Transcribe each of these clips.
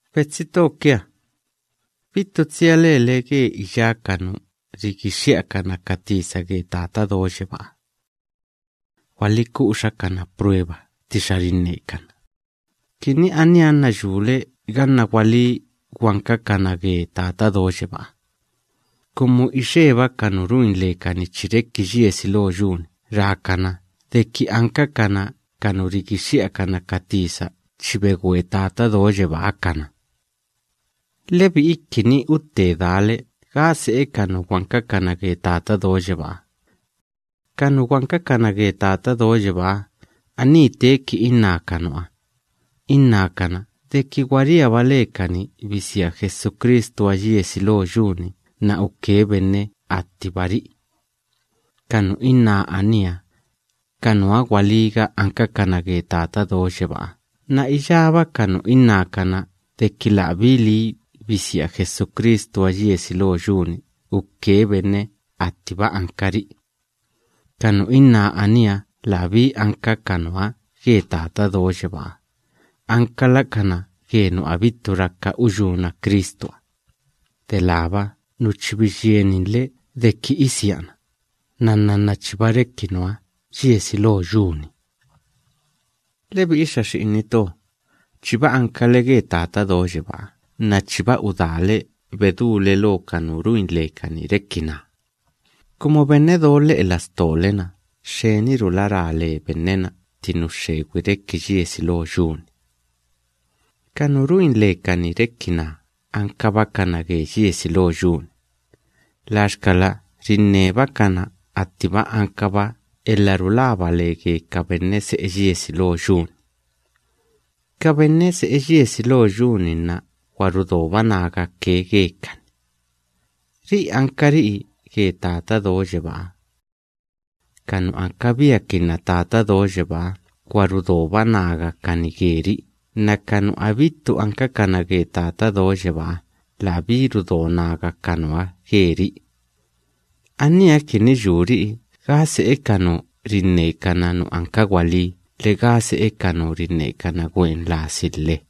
Betsi to kia, bittu tsia lele ge iyá ka nu rigixxi'akana ka tisa ge Tata Do Yebáha. Gwaliku'uxa kana prueba ttixa rinnekana, kini aníha nna yule ganna gwalí gwankakana ge Tata Do Yebáha, kumu ixeba ka nu ruin lekani chi reki yiesi lo yu‑ni rákana deki ankakana ka nu rigixxi'akana ka tisa chi begwe Tata Do Yebáha kana. Lebi'i kini utte dale gá se'e ka nu gwankakana ge Tata Do Yebáha: ka nu gwankakana ge Tata Do Yebáha, aní teeki inná ka nuha, innákana deki gwa riaba lekani bisia Jesucristuha yiesi lo yu‑ni nna uke benne attibari'i. Ka nu inná aníha, lakana nuha gwalíga ankakana ge Tata Do Yebáha nna iyába ka nu innákana deki labí lii bisia Jesucristuha yiesi lo yu‑ni uke benne attiba ankari'i, ka nu inná aníha labí anka ka nuha ge Tata Do Yebáha, ankalakana ge nu abittu raka uyúna Cristuha, delába nu chi biyieninle deki isiana, nnanna nna chiba reki nuha yiesi lo yu‑ni. Lebi'i xa xi'ini to, chiba ankale ge Tata Do Yebáha nna chiba udaale bedúle lo ka nu ruin lekani reki naa, kumu benne do lhe'e lastole‑na xxenirula ra le benne‑na tti nu xxegwi reki yiesi lo yu‑ni. Ka nu ruin lekani reki naa ankabakana ge yiesi lo yu‑ni, laxkala rinnebakana attiba ankaba elha rulaba le ge ka benne se'e yiesi lo yu‑ni. Ka benne se'e yiesi lo yu‑ni nna gwa rudoba nagake gekani. Ri'i ankari'i ge Tata Do Yebáha nna iyába ka nu ankabiakinna Tata Do Yebáha gwa rudoba nagakani geri'i nna ka nu abittu ankakana ge Tata Do Yebáha labí rudo naga ka nuha geri'i. Aníha kini yuri'i gá se'e ka nu rinnekana nu anka gwalí lhe gá se'e ka nu rinnekana gwen lasi lhe.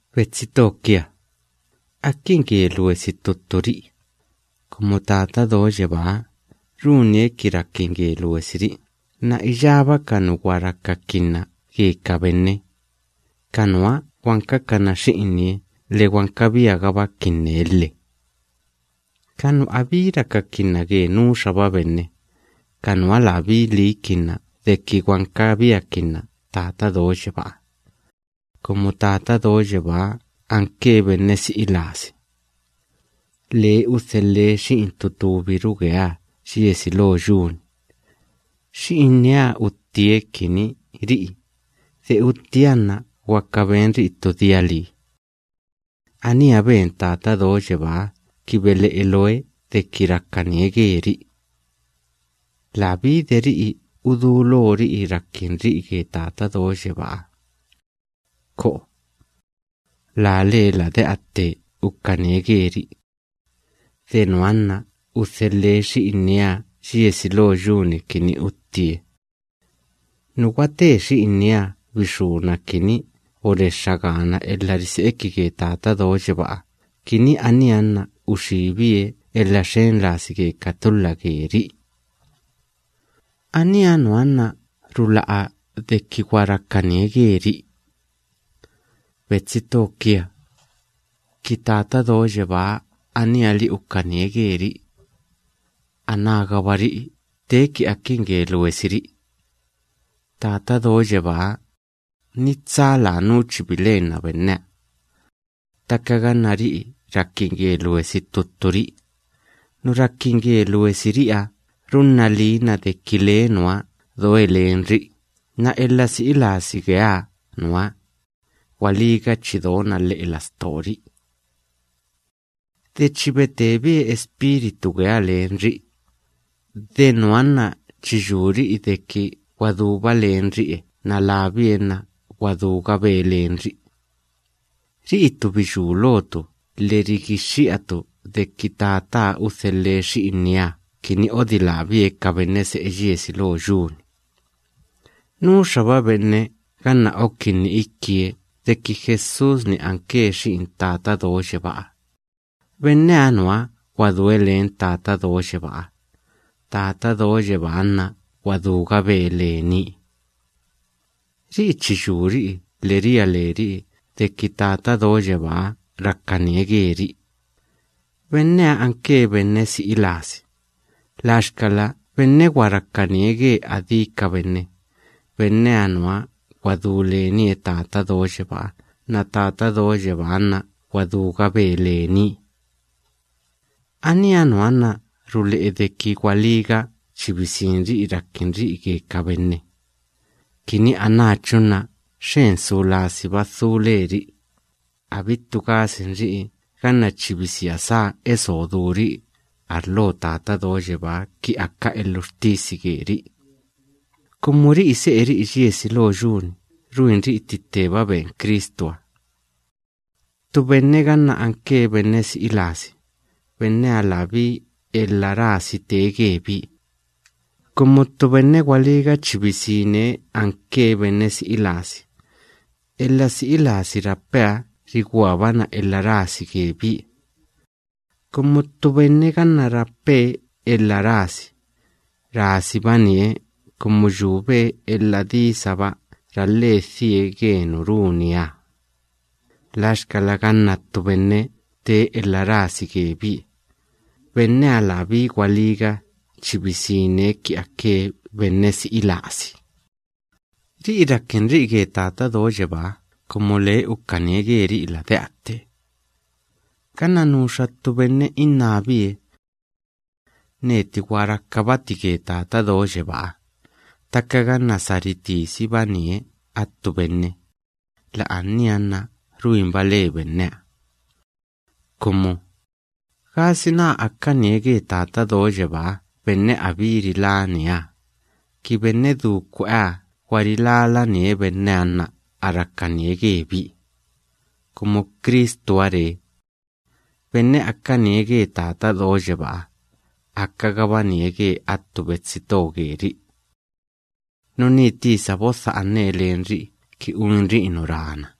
Betsi to kia, akin ge luesi ttu tturi'i, kumu Tata Do Yebáha runie kini rakin ge luesiri'i nna iyába ka nu gwa rakakinna ge ka benne, lakana nuha gwankakana xi'inie lhe gwankabiagabakinne lhe. Ka nu abí rakakinna ge nuxaba benne, ka nuha labí liikinna deki gwankabiakinna Tata Do Yebáha, kumu Tata Do Yebáha anke benne si'i lasi. Labie udhelhe Xi'in ttu túbiru geeha yiesi lo yu‑ni. Xi'inieha uttie kini ri'i, de utti benneha nna gwaka benri'i ttu dia lii. Aníha ben Tata Do Yebáha kini bele'e looe deki rakanie geri'i. Labí de ri'i udulori'i rakinri'i ge Tata Do Yebáha. ¡Ko'o! Lalee lade'a tte ukanie geri'i. De nuha nna udhelhe Xi'inieha yiesi lo yu‑ni kini uttie. Nu gwate Xi'inieha bixúna kini borexxa gaana elha rise'iki ge Tata Do Yebáha kini aníha nna uxíbie elha xen lasi ge ka tulha geri'i. Aníha nuha nna rula'a deki gwa rakanie geri'i. Betsi to kia, ki Tata Do Yebáha aníha‑li ukanie geri'i, anágaba ri'i teeki akin ge luesiri'i. Tata Do Yebáha, ni tsa lanú chi bilenna benneha. Ttaka ganna ri'i rakin ge luesi ttu tturi'i, nu rakin ge luesiri'iha runna liina deki lee nuha doe lenri'i nna elha si'i lasi geeha nuha, gwalíga chi dona lhe'e lastori'i. Labie de chi betebie Espíritu geeha lenri'i, de nuha nna chi yuri'i deki gwa duba lenri'e nna labie nna gwa dúgabe lenri'i. Ri'itu biyú lotu lhe rigixxi'atu deki Tataha udhelhe Xi'inieha kini odilábie ka benne se'e yiesi lo yu‑ni. Nuxaba benne ganna okinni ikie deki Jesús‑ni anke Xi'in Tata Do Yebáha, benneha nuha gwa due len Tata Do Yebáha, Tata Do Yebáha nna gwa dúgabe lenie. Ri'i chi yuri'i lhe ria leri'i deki Tata Do Yebáha rakanie geri'i. Benneha anke benne si'i lasi, laxkala benne gwa rakanie ge adí ka benne, benneha nuha gwa du lenie Tata Do Yebáha nna Tata Do Yebáha nna gwa dúgabe lenie. Aníha nuha nna rule'e deki gwalíga chi bisinri'i rakinri'i ge ka benne, kini anáchu nna xen su lasiba dhu leri'i, abittu gasinri'i ganna chi bisia sá eso duri'i arlo Tata Do Yebáha ki aka elhuxtisi geri'i, kumu ri'i se'eri'i yiesi lo yu‑ni ruinri'i tti tteba ben Cristuha. Ttu benne ganna anke benne si'i lasi, benneha labí elha rasi tee gebie, kumu ttu benne gwalíga chi bisine anke benne si'i lasi, elha si'i lasi rapeha riguabana elha rasi gebie. Kumu ttu benne ganna rape elha rasi, rasibanie kumu yube elha disaba ralhe dhie ge nu runieha. Laxkala ganna ttu benne tee elha rasi gebie, benneha labí gwalíga chi bisine ki ake benne si'i lasi. Ri'i rakinri'i ge Tata Do Yebáha kumu lee ukanie geri'i lade'a tte. Ganna nuxa ttu benne innábie: “Neti gwa rakabati ge Tata Do Yebáha”, ttaka ganna sa ritisibanie attu benne, la'ania nna ruinba le benneha. Kumu, ¿gasina akanie ge Tata Do Yebaa benne abí rilánieha, ki benne du kwe'eha gwa rilálanie benneha nna a rakanie gebie? Kumu Cristuha ree: “Benne akanie ge Tata Do Yebáha, akagabanie ge attu betsi to geri'i.” Nuní tisa bodha'ane lenri'i kini uinri'i nu rana.